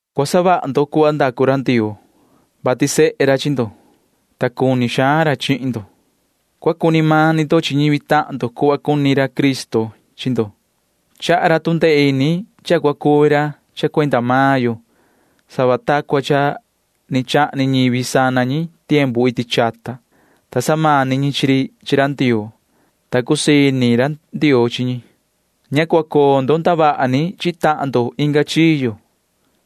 Cua savaha ndo cuhva ndacu ra Ndioo, vati sehe ra chi ndo, ta cuni xaan ra chihin ndo. Cua cuni mani ndo chi ñivi tahan ndo cuhva cuni ra Cristo chi ndo. Chaha ra tu ndee ini cha cua cuvi ra cuenda maan yo sava ta cua ni chahni ñivi sana ñi iti chata, ta samani ñi chi ri chi ra Ndioo, ta cusii ini ra Ndioo chi ñi. Ña cua coo ndo ndavaha ni chi tahan ndo inga chiyo,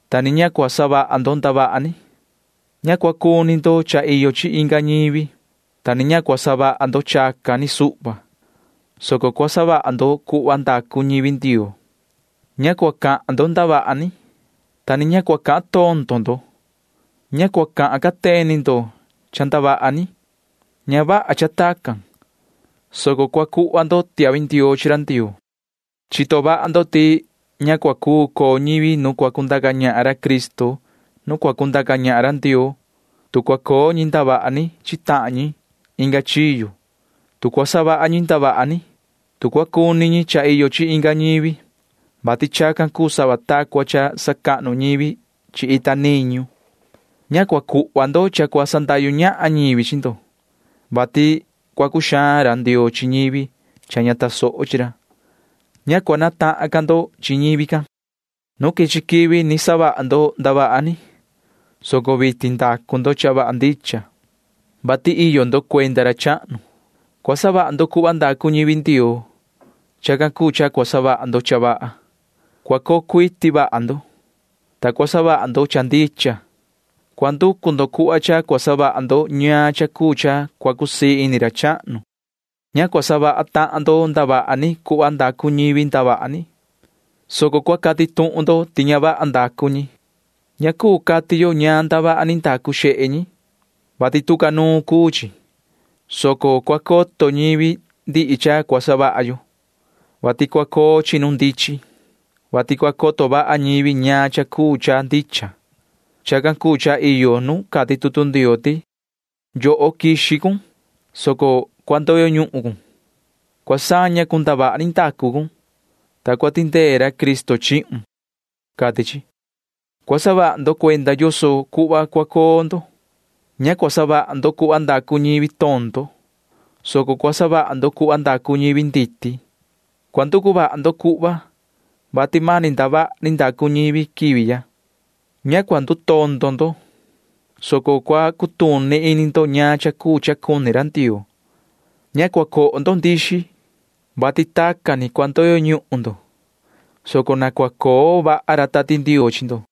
ta ni ña cua savaha ndo ndavaha ni. Ña cua cuni ndo cha iyo chi inga ñivi, ta ni ña cua savaha ndo chacan ni suhva, soco cua savaha ndo cuhva iyo cha cua savaha ñivi Ndioo. Ña cua cahan ndo ndavaha ni, ta ni ña cua cahan tondo ndo. Ña cua cahan cateni ndo cha ndavaha ni. Ña vaha cha tacan, soco cua cuhva ndo tiahvi ndioo chi ra Ndioo. Cua coto vaha ndo ti ña cua cuu coo ñivi nu cua cundaca ñahan ra Cristo nu cua cundaca ñahan ra Ndioo, tu cua coo ñi ndavaha ni chi tahan ñi inga chiyo, tu cua savaha ñi ndavaha ni, tu cua cuni ñi cha iyo chi inga ñivi, vati chacan cuu sava ta cua cha sacahnu ñivi chi ita niñu. Ña cua cuhva ndo cha cua sandahyu ñahan ñivi chi ndo, vati chacan ni cua cuxaan ini ra Ndioo chi ñivi ña tasoho chi ra. Ña cua natahan ca ndo chi ñivi can. Nu quichi quivi ni savaha ndo ndavaha ni, soco vitin ndacu ndo cha vaha ndicha, vati iyo ndo cuenda ra chahnu. Cua savaha ndo cuhva ndacu ñivi Ndioo. Chacan cuu cha cua savaha ndo cha vaha. Cua coo cuiti vaha ndo, ta cua savaha ndo cha ndicha. Cua nducu ndo cuhva cha cua savaha ndo ñaan cha cuu cha cua cusii ini ra chahnu. Ña cua savaha tahan ndo ndavaha ni cuhva ndacu ñivi ndavaha ni, soco cua cati tuhun ndo ti ña vaha ndacu ñi. Ña cuu cati yo ñaan ndavaha ni ndacu xehe ñi, vati tu ca nuun cuu chi, soco cua coto ñivi ndihi cha cua savaha yo, vati cua coo chi nu ndichin, vati cua coto vaha ñivi ñaan cha cuu cha ndicha. Chacan cuu cha iyo nu cati tutu Ndioo ti: Yoho, quixi cun, soco cua ndoyo cun. Cua saña cun ndavaha ni ndacu cun, ta cua tindee ra Cristo chihun, cati chi. Cua saha vaha ndo cuenda yoso cuhva cua coo ndo. Ña cua savaha ndo cuhva ndacu ñivi tondo, soco cua savaha ndo cuhva ndacu ñivi nditi. Cua nducu vaha ndo cuhva, vati mani ndavaha ni ndacu ñivi quivi ya. Ña cua ndutondo ndo, soco cua cutuni ini ndo ñaan cha cuu cha cuni ra Ndioo. Ña cua coho ndo nduta xaan, vati tacan ni cua ndoyo ñuhun ndo, soco na cua coo vaha ra Tati Ndioo chi ndo.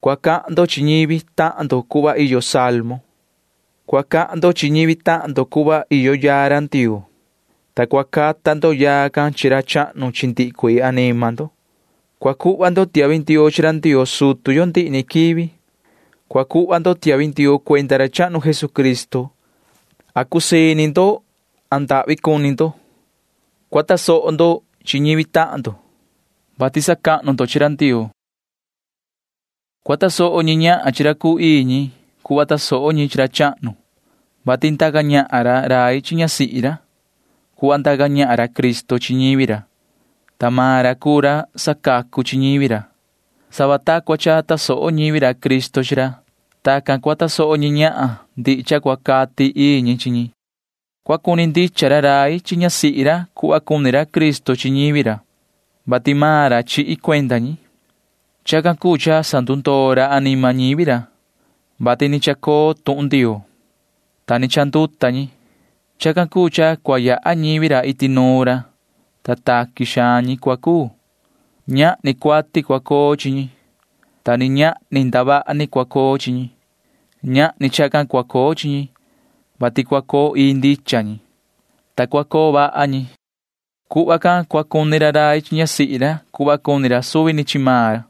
Cua cahan ndo chi ñivi tahan ndo cuhva iyo salmo. Cua cahan ndo chi ñivi tahan ndo cuhva iyo yaa Ndioo, ta cua cata ndo yaa can chi ra chahnu chi ndihi cuii anima ndo. Cua cuhva ndo tiahvi ndioo chi ra Ndioo sutu yo ndihi ni quivi. Cua cuhva ndo tiahvi ndioo cuenda ra chahnu Jesucristo―masi cusii ini ndo, masi ndahvi cuni ndo. Cua tasoho ndo chi ñivi tahan ndo, vati sacahnu ndo chi ra Ndioo. Cua tasoho ñi ñahan chi ra cuu ii ñi cuhva tasoho ñi chi ra chahnu, vati ndaca ñahan ra rai chi ñasihi ra cuhva ndaca ñahan ra Cristo chi ñivi ra, ta maan ra cuu ra sacacu chi ñivi ra. Cuhva tasoho ñivi ra Cristo chi ra―tacan cua tasoho ñi ñahan ndihi cha cua cati ii ñi chi ñi. Cua cuni ndicha ra rai chi ñasihi ra cuhva cuni ra Cristo chi ñivi ra, ta maan ra chihi cuenda ñi. Chacan cuu cha sandundoo ra anima ñivi ra, vati ni chacoo tuhun Ndioo, ta ni chanduta ñi. Chacan cuu cha cua yaha ñivi ra iti nuun ra, ta taqui xaan ñi cua cuu. Ñahni cuati cua coo chi ñi, ta ni ñahni ndavaha ni cua coo chi ñi. Ñahni chacan cua coo chi ñi, soco cua coo ii ñi, ta cua coo vaha ñi. Tacan ni cua cuni ra rai chi ñasihi ra cuhva cuni ra suvi ni chi maan ra.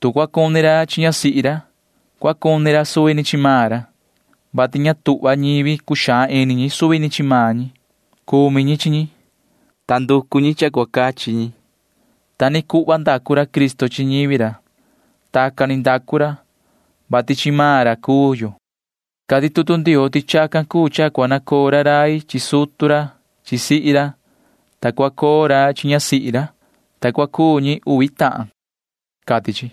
Tu cua cuni ra chi ñasihi ra, cua cuni ra suvi ni chi maan ra, vati ña tuhva ñivi cuxaan ini ñi suvi ni chi maan ñi. Cumi ñi chi ñi, ta nducu ñi cha cua cachi ñi. Ta ni cuhva ndacu ra Cristo chi ñivi ra. Tacan ni ndacu ra, vati chi maan ra cuu yo. Cati tutu Ndioo ti chacan cuu cha cua nacoo ra rai chi sutu ra chi sihi ra, ta cua coo ra chi ñasihi ra, ta cua cuu ñi uvi tahan, cati chi.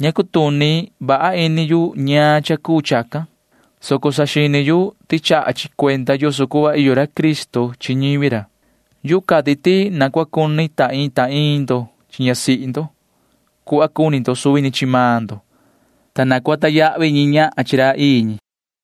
Ña cutuni vaha ini yu ñaan cha cuu chacan, soco saxini yu ti chaha chi cuenda yoso cuhva iyo ra Cristo chi ñivi ra. Yuhu cati ti na cua cuni ta iin ta iin ndo chi ñasihi ndo cuhva cuni ndo suvi ni chi maan ndo, ta na cua sacahnu ñi ñahan chi maan ra ii ñi.